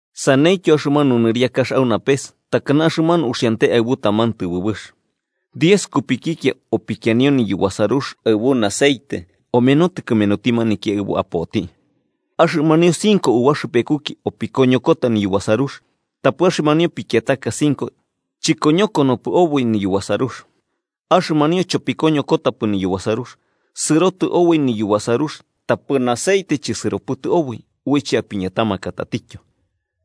“Saneityo axɨmanu nɨriakax au napes takana axɨmanu uxiante aɨbu taman tɨbɨbɨx: diez kupikikia opikianio niyubasarux aɨbu aceite omenotɨ kɨmenuti maniki aɨbo apoti. Axɨmanio cinco ubaxɨpekuki opikoñokota niyubasarux tapɨ axɨmanio pikiataka cinco chɨkoñokonopɨ oboi niyubasarux. Axɨmanio chopikoñokotapɨ niyubasarux, sɨrotɨ oboi niyubasarux tapɨ aceite chɨsɨropɨtɨ oboi uiche apiñatamaka tatityo.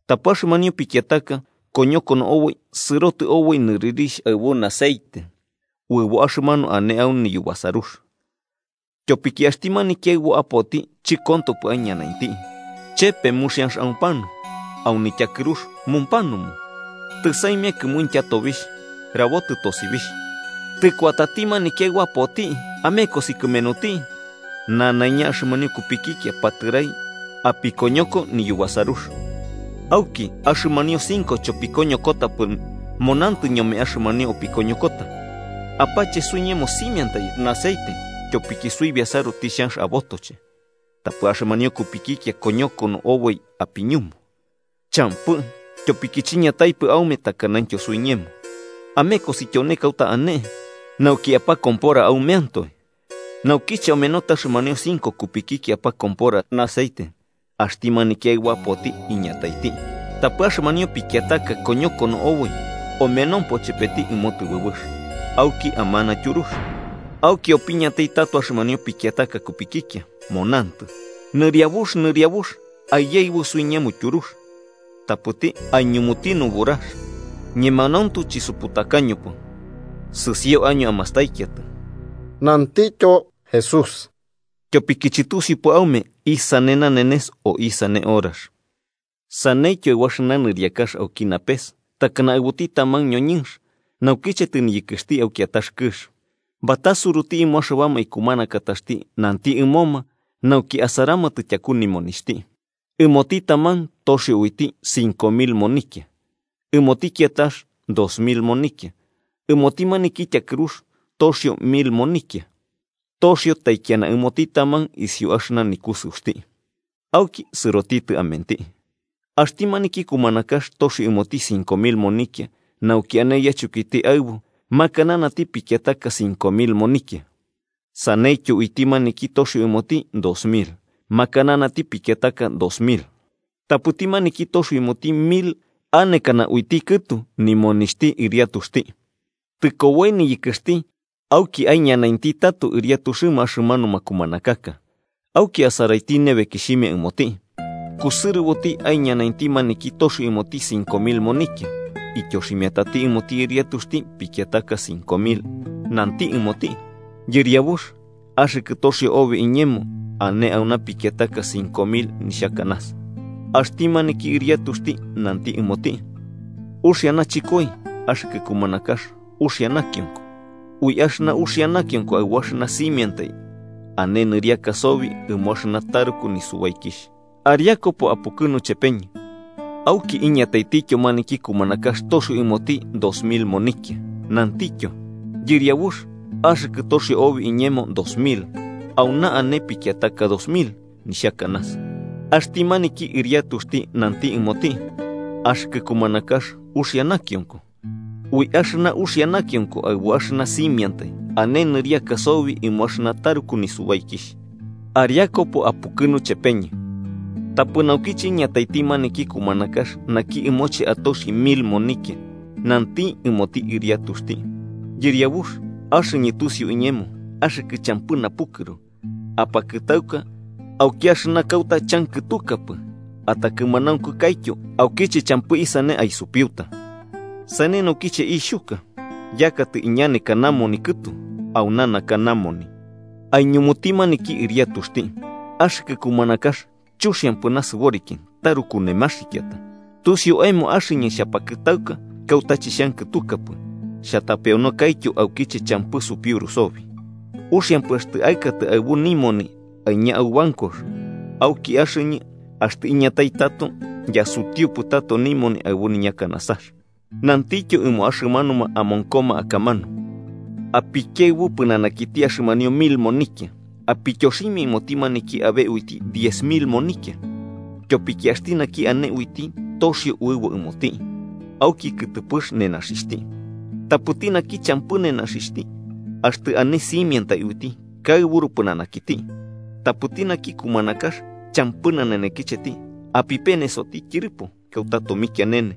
Tapɨ axɨmanio pikiataka, koñokono oboi sɨrotɨ oboi nɨrɨrixh aɨbu aceite, uɨbo axɨmanu ane au niyubasarux. Tyopiki axti maniki aɨbo apoti chɨkontopɨ aiñanainti, chepe muxianx aupanu, au nityakɨrux mumpanumu. Tɨsaimia kɨmuintya tobixh, rabotɨ tosibixh: ‘¡Tɨkuatati maniki aɨbo apoti! ¡Amekosi kɨmenuti!’ Nanaiña axɨmanio kupikikia patɨrai apikoñoko niyubasarux. Auki axɨmanio cinco chopikoñokotapɨ munantɨ ñome axɨmanio opikoñokota: ‘Apache suiñemo simiantai aceite, tyopiki suibiasaru tixhanx abotoche.’ Tapɨ axɨmanio kupikikia koñokono oboi apiñumu: ‘Champɨ, tyopiki chiñataipɨ aume takanaityo suiñemo. Amekosi tyone kauta ane, nauki apokompora aumeantoe.’ Naukiche omenotɨ axɨmanio cinco kupikikia apakompora aceite, axti maniki aɨbo apoti iñataiti, tapɨ axɨmanio pikiataka koñokono oboi omenompo chepeti ɨmo tɨbɨbɨx, auki amana tyurux. Auki opiñatai tato axɨmanio pikiataka kupikikia, monantɨ: ‘¡Nɨriabux, nɨriabux, aiyaɨbu suiñemo tyurux!’ Tapɨti aiñumuti nuburax: ‘Ñemanauntu chisuputakañopɨ.’ “Sɨsio año amastaikiatɨ–nantityo Jesús–, tyopiki chɨtusiupɨ aume isane nanenes o isane horax. “Saneityo aɨbu axɨna nɨriakax auki napes takana aɨbuti taman ñoñɨnx, naukiche tɨniyɨkɨxti au kiatax kɨx, batasuruti ɨmo axɨbama ikumanakataxti nanti ɨmoma nauki asaramatɨ tyaku nimonixhti. Ɨmoti taman toxio uiti cinco mil monikia, ɨmoti kiatax dos mil monikia ɨmoti maniki tyakɨrux toxio mil monikia: toxio taikiana ɨmoti taman isiu axɨna nikusɨuxti. Auki sɨrotitɨ amenti. Axti maniki kumanakax toxio ɨmoti cinco mil monikia nauki ane yachɨkoiti aɨbu makananati pikiataka cinco mil monikia. Saneityo, uiti maniki toxio ɨmoti dos mil makananati pikiataka dos mil. Tapɨti maniki toxio ɨmoti mil anekana uiti kɨtu nimonixhti ɨriatuxti. Tɨkoboi niyɨkɨxti auki aiñanainti tato ɨriatuxɨma axɨmanuma kumanakaka, auki asaraiti nebekixhimia ɨmoti. Kusɨrɨboti aiñanainti maniki toxio ɨmoti cinco mil monikia, ityoximiatati ɨmoti ɨriatuxti pikiataka cinco mil, nanti ɨmoti: ‘Yɨriabux, axɨkɨ toxio obi iñemo, ane auna pikiataka cinco mil nixhakanasa.’ Axti maniki ɨriatuxti nanti ɨmoti: ‘Uxia nachɨkoi, axɨkɨ kumanakax uxia nakionko. Ui axɨna uxia nakionko aɨbu axɨna simiantai, ane nɨriaka sobi ɨmo axɨna taruku nisubaikixh. Ariakupo apukɨnu chepeñɨ.’ Auki iñataitityo maniki kumanakax toxio ɨmoti dos mil monikia, nantityo: ‘Yɨriabux, axɨkɨ toxio obi iñemo dos mil, auna ane pikiataka dos mil, nixhakanasa.’ Axti maniki ɨriatuxti nanti ɨmoti: ‘Axɨkɨ kumanakax uxia nakionko. Ui axɨna uxia nakionko aɨbu axɨna simiantai, ane nɨriaka sobi ɨmo axɨna taruku nisubaikixh. Ariakupo apukɨnu chepeñɨ.’ “Tapɨ naukiche iñataiti maniki kumanakax naki ɨmoche atoxi mil monikia, nanti ɨmoti ɨriatuxti: ‘Yɨriabux, axɨñɨ tusiu iñemo axɨkɨ champɨ napukɨru, apakɨtauka auki axɨna kauta chankɨtukapɨ atakɨmanaunkukaityo aukiche champɨ isane aisupiuta. Sane naukiche ixhuka, yakatɨ iñaneka namoni kɨtu. Auna naka namoni.’ Aiñumuti maniki ɨriatuxti: ‘Axɨkɨ kumanakax chuxiampɨ nasɨboriki taruku nemaxikiata, tusiu aemo axɨñɨ xhapakɨtauka kauta chixhankɨtukapɨ xhatapeonokaityo aukiche champɨ supiuru sobi, uxiampɨ axtɨ aɨkatɨ aɨbu nimoni aiña au bancox, auki axɨñɨ, axtɨ iñatai tato, yasutiupɨ tato nimoni aɨbu ñakanasax.’ Nantityo ɨmo axɨmanuma amonkoma akamanu: ‘Apikiaɨbu pɨnanakiti axɨmanio mil monikia, apityoximia ɨmoti maniki abe uiti diez mil monikia. Tyopiki axti naki ane uiti, toxio uɨbo ɨmoti, auki kɨtɨpɨx nenaxixhti. Tapɨti naki champɨ nenaxixhti, axtɨ ane simiantai uiti kaɨburu pɨnanakiti. Tapɨti naki kumanakax champɨ nanenekicheti, apipenesoti tyɨrɨpo, kauta tomikianene.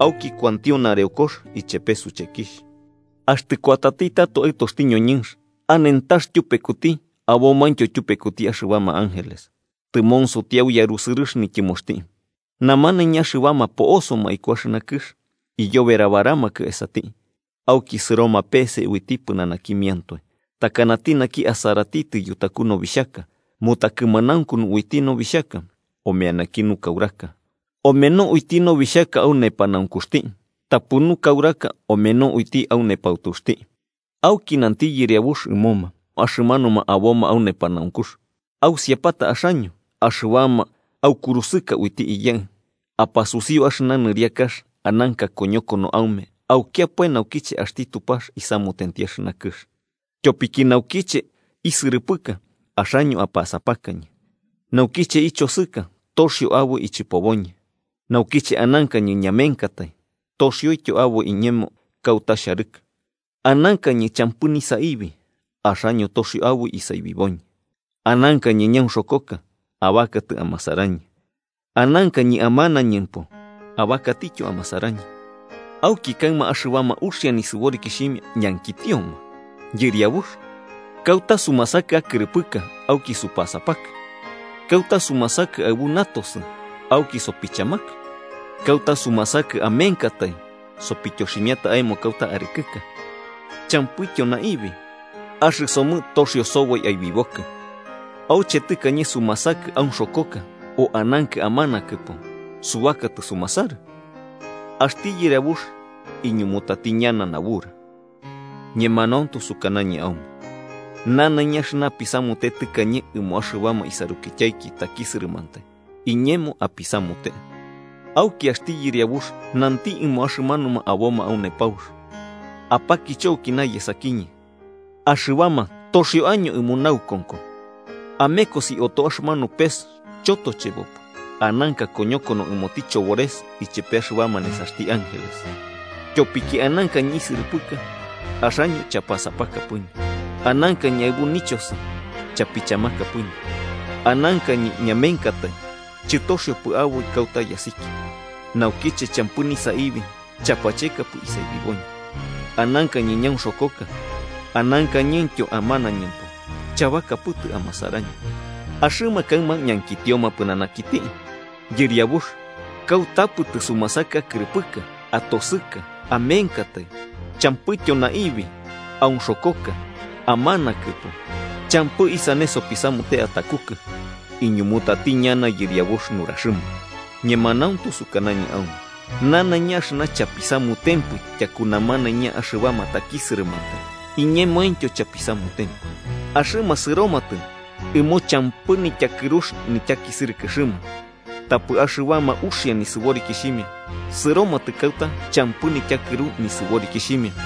Auki kuantio nareokox ichepe suchekixh.’ “Axtɨ kuatati tato Aɨtoxti ñoñɨnx, anentax tyupekuti abomaintyo tyupekuti axɨbama ángeles, tɨmonsoti au yarusɨrɨx nityɨmoxti. Namanaiña axɨbama po'osoma iku axɨna kɨx iyoberabaramakɨ esati, auki sɨroma peese uiti pɨnanakimiantoe, takanati naki asaratitɨ yutaku nobixhaka mu takɨmanaunkunu uiti nobixhaka omeanaki nukauraka. Omeno uiti nobixhaka au nepanaunkuxti tapɨ nukauraka omeno uiti au nepautuxti. Auki nanti yɨriabux ɨmoma axɨmanuma aboma au nepanaunkux: ‘Ausiapata axaño, axɨbama aukurusɨka uiti Iyaɨ. Apasusiu axɨna nɨriakax ananka koñokono aume aukiapae naukiche axti Tupax isamutenti axɨna kɨx. Tyopiki naukiche isɨrɨpɨka, axaño apasapakañɨ. Naukiche ichosɨka, toxio aboi ichɨpoboñɨ. Naukiche anankañɨ ñamenkatai, toxioityo aboi iñemo kauta xharɨkɨ. Anankañɨ champɨ nisaibi, axaño toxio aboi isaibiboñɨ. Anankañɨ ñaunxokoka, abakatɨ amasarañɨ. Anankañɨ amanañɨmpo, abakatityo amasarañɨ.’ Auki kaɨma axɨbama uxia nisɨborikixhimia ñankitioma: ‘Yɨriabux, ¿kauta sumasakɨ akɨrɨpɨka, auki supasapakɨ? ¿Kauta sumasakɨ aɨbu natosɨ, auki sopichamakɨ? ¿Kauta sumasakɨ amenkatai, sopityoximia aemo kauta arɨkɨka, champɨityo naibi, axɨsomɨ toxio soboi aibibokɨ? ¿Auche tɨkañe sumasakɨ aunxokoka o anankɨ amanakɨpo, subakatɨ sumasarɨ?’ Axti yɨriabux iñumutati ñana nabura: ‘Ñemanauntu sukanañɨ aume nanaiña axɨna apisamute tɨkañe ɨmo axɨbama isarukityaiki takisɨrɨmantai, iñemo apisamute.’ “Auki axti yɨriabux nanti ɨmo axɨmanuma aboma au nepaux: ‘Apakicho aukina yesakiñɨ, axɨbama toxio año ɨmo naukonko. Amekosi oto axɨmanu pes chotochebopɨ ananka koñokono ɨmoti chobores ichepe axɨbama nesaxti ángeles. Tyopiki anankañɨ isɨrɨpɨka, axaño chapasapakapɨñɨ. Anankañɨ aɨbu nichosɨ, chapichamakapɨñɨ. Anankañɨ ñamenkatai, chɨtoxiopɨ aboi kauta yasikia. Nukiche champɨ nisaibi, chapachekapɨ isaibiboñɨ. Anankañɨ ñaunxokoka, anankañɨntyo amanañɨmpo, chabakapɨtɨ amasarañɨ.’ Axɨma kaɨma ñankitioma pɨnanakiti: ‘Yɨriabux, ¿kautapɨ tɨsumasakɨ akɨrɨpɨka, atosɨka, amenkatai, champɨityo naibi, aunxokoka, amanakɨpo, champɨ isane sopisamute atakukɨ?’ Iñumutati ñana Yɨriabux nuraxɨma: ‘Ñemanauntu sukanañɨ aume nanaiña axɨna chapisamutempɨ tyakuma namanaiña axɨbama takisɨrɨmantai, iñemointyo chapisamutempɨ.’ Axɨma sɨromatɨ ɨmo champɨ nityakɨrux nityakisɨrɨkɨxɨma, tapɨ axɨbama uxia nisɨborikixhimia sɨromatɨ kauta champɨ nityakɨru nisɨborikixhimia.”